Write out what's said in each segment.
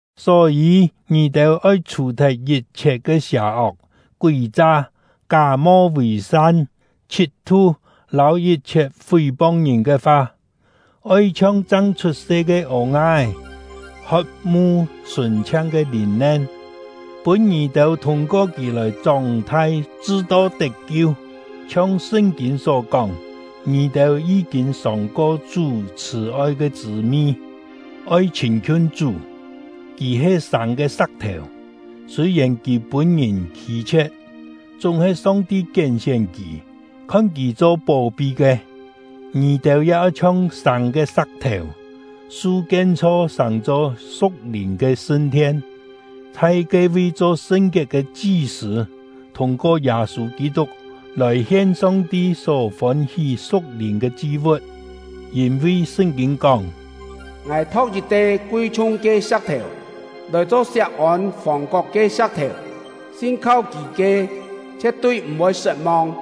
Só-yî, ngì-têu oi chhù-thet yit-chhiet ke sià-ok, kúi-cha, ká-mo vì-san, chhit-tu, lâu yit-chhiet fí-pong ngìn ke fa; oi chhiong chang chhut-se ke ô-nga-é, hot-mu sùn-chhiang ke lìn-nen, pûn ngì-têu thûng-ko kì lòi chóng-thai chṳ-to tet-kiu. Chhiong Sṳn-kîn só kóng: “Ngì-têu yí-kîn sòng-ko Chú chhṳ̀-oi ke chṳ̂-mi.” Oi chhîn-khiun Chú, kì he sâng ke sa̍k-thèu; sûi-yèn kì pûn-ngìn khî-chhie̍t, chúng-he Song-ti kién-sién kì, khon kì cho pó-pi ke. Ngì-têu ya oi chhiong sâng ke sa̍k-thèu, su kien-chho sàng-cho su̍k-lìn ke sṳn-thien, chhai ke-vi cho sṳn-kiet ke chi-sṳ̂, thûng-ko Yâ-sû Kî-tuk lòi hien Song-ti só fôn-hí su̍k-lìn ke chi-vu̍t. Yîn-vi Sṳn-kîn kóng: Ngài tho̍k yit-te kui-chhung ke sa̍k-thèu, lòi cho Siak-ôn fòng-kok ke sa̍k-thèu; sin-kho kì ke, chhie̍t-tui m̀-voi sṳt-mong.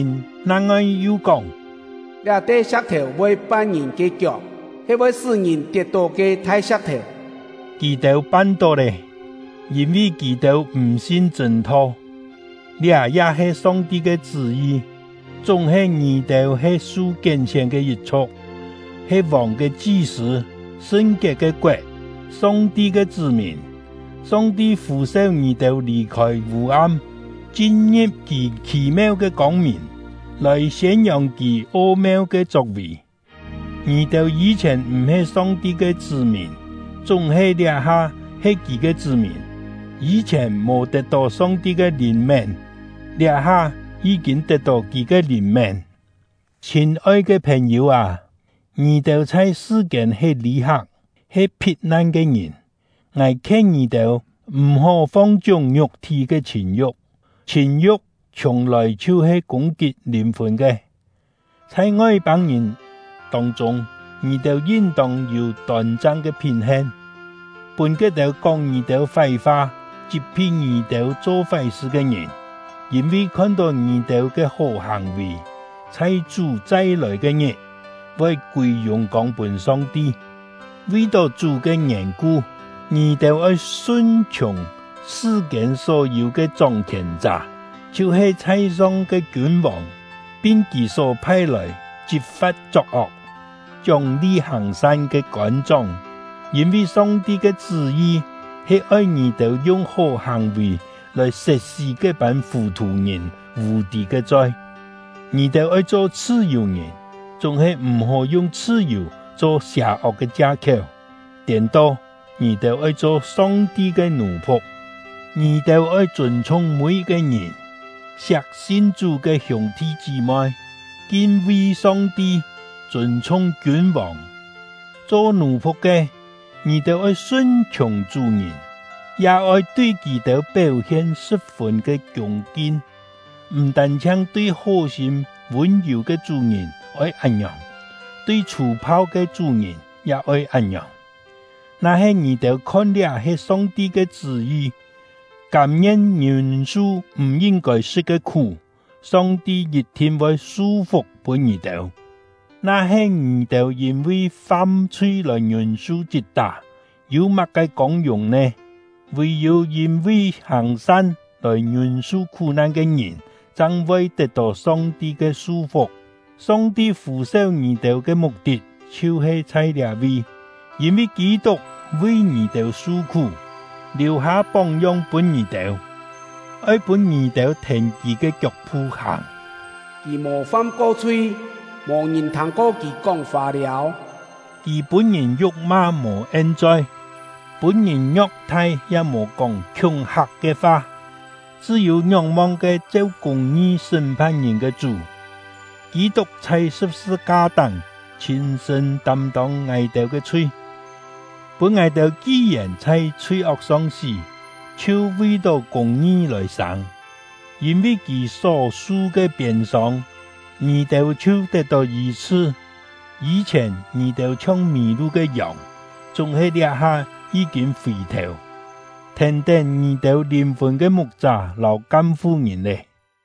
Sṳn-kîn nang-ngoi yu kóng: Liá-te sa̍k-thèu voi pan ngìn ke kiok, he voi sṳ́-ngìn tiet-tó ke thai sa̍k-thèu! Kì-têu pan-tó lé, yîn-vi kì-têu m̀ sin chṳ̂n-tho; liá ya he Song-ti ke chṳ́-yi. Chúng-he, ngì-têu he su kién-sién ke yit-chhu̍k, he Vòng ke chi-sṳ̂, sṳn-kiet ke koet, Song-ti ke chṳ́-mìn. Song-ti fû-seu ngì-têu lì-khôi vû-am, chin-ngi̍p Kì khì-meu ke kông-mìn, lòi siên-yòng Kì o-meu ke chok-vì. Ngì-têu yî-chhièn m̀-he Song-ti ke chṳ́-mìn, chúng-he liá-ha he Kì ke chṳ́-mìn; yî-chhièn mò tet-tó Song-ti ke lìn-mén, liá-ha yí-kîn tet-tó Kì ke lìn-mén. Chhîn-oi ke phèn-yû â, ngì-têu chhai sṳ-kiên he lî-hak, he phit-nan ke ngìn! Ngài khien ngì-têu, m̀-hó fong-chiúng ngiuk-thí ke chhìn-yu̍k; chhìn-yu̍k chhiùng-lòi chhiu-he kûng-kit lìn-fùn ke. Chhai Ngoi-pâng-ngìn tông-chûng, ngì-têu yin-tông yû tôn-chang ke phín-hen, pûn ke-têu kóng ngì-têu fái-fa, chit-phi ngì-têu cho fái-sṳ ke ngìn, yîn-vi khon-tó ngì-têu ke hó hàng-vì, chhai Chú chai-lòi ke-ngit, voi kûi yùng-kông pûn Song-ti. Vi-tó Chú ke yèn-ku, ngì-têu oi sun-chhiùng sṳ-kiên só-yû ke chóng-khièn-chá, chhiu-he chhai-song ke kiûn-vòng, pin kì só phai-lòi chit-fa̍t chok-ok, chióng-li hàng-san ke kôn-chóng. Yîn-vi Song-ti ke chṳ́-yi he oi ngì-têu yung hó hàng-vì lòi set-sí ke-pân fù-thù-ngìn vù-tî ke choi. Ngì-têu oi cho chhṳ-yù-ngìn! Chúng-he m̀-hó yung chhṳ-yù cho sià-ok ke chia-khiéu; tiên-to, ngì-têu oi cho Song-ti ke nù-phu̍k. Ngì-têu oi chûn-chhung mî-yit-ke ngìn; siak sin Chú ke hiûng-thi chí-moi; kin-vi Song-ti; chûn-chhung kiûn-vòng. Cho nù-phu̍k ke, ngì-têu oi sun-chhiùng chú-ngìn, ya oi tui kì-têu péu-hien sṳ̍p-fûn ke kiûng-kin; m̀ tân-chhiang tui hó-sîm vûn-yù ke chú-ngìn oi án-ngiòng, tui chhû-phau ke chú-ngìn ya oi án-ngiòng. Na-he ngì-têu khon liá he Song-ti ke chṳ́-yi, kâm-ngien ngiûn-su m̀ yin-kôi sṳ̍t ke khú, Song-ti yit-thin voi su-fuk pûn ngì-têu. Na-he ngì-têu yîn-vi fam-chhui lòi ngiûn-su chit-tá, yû má-ke kông-yùng nè? Vì-yû yîn-vi hàng-san lòi ngiûn-su khú-nan ke ngìn chang voi tet-tó Song-ti ke su-fuk. Song-ti fû-seu ngì-têu ke muk-tit chhiu-he chhai liá-vi; yîn-vi Kî-tuk vi ngì-têu su-khú, liù-hâ póng-yong pûn ngì-têu, oi pûn ngì-têu thèn kì ke kiok-phu hàng. Kì mò fam-ko chhui; mò ngìn thâng-ko kì kóng fâ-liâu. Kì pûn-ngìn yu̍k-ma mò en-choi, pûn-ngìn ngio̍k-thai ya mò kóng khiúng-hak ke fa, chṳ́-yû ngióng-mong ke cheu kûng-ngi sṳ́m-phan ngìn ke Chú. Kî-tuk chhai sṳ̍p-sṳ-ka-táng chhîn-sṳ̂n tâm-tông ngài-têu ke chhui, pûn ngài-têu ki-yèn chhai chhui-ok-song sí, chhiu vi-tó kûng-ngi lòi sâng. Yîn-vi kì só-su ke piên-sông, ngì-têu chhiu tet-tó yî-chhṳ. Yî-chhièn ngì-têu chhiong mì-lu ke yòng, chúng-he liá-ha yí-kîn fì-thèu, thèn-tén ngì-têu lìn-fùn ke mu̍k-chá lâu kam-fu-ngìn lé.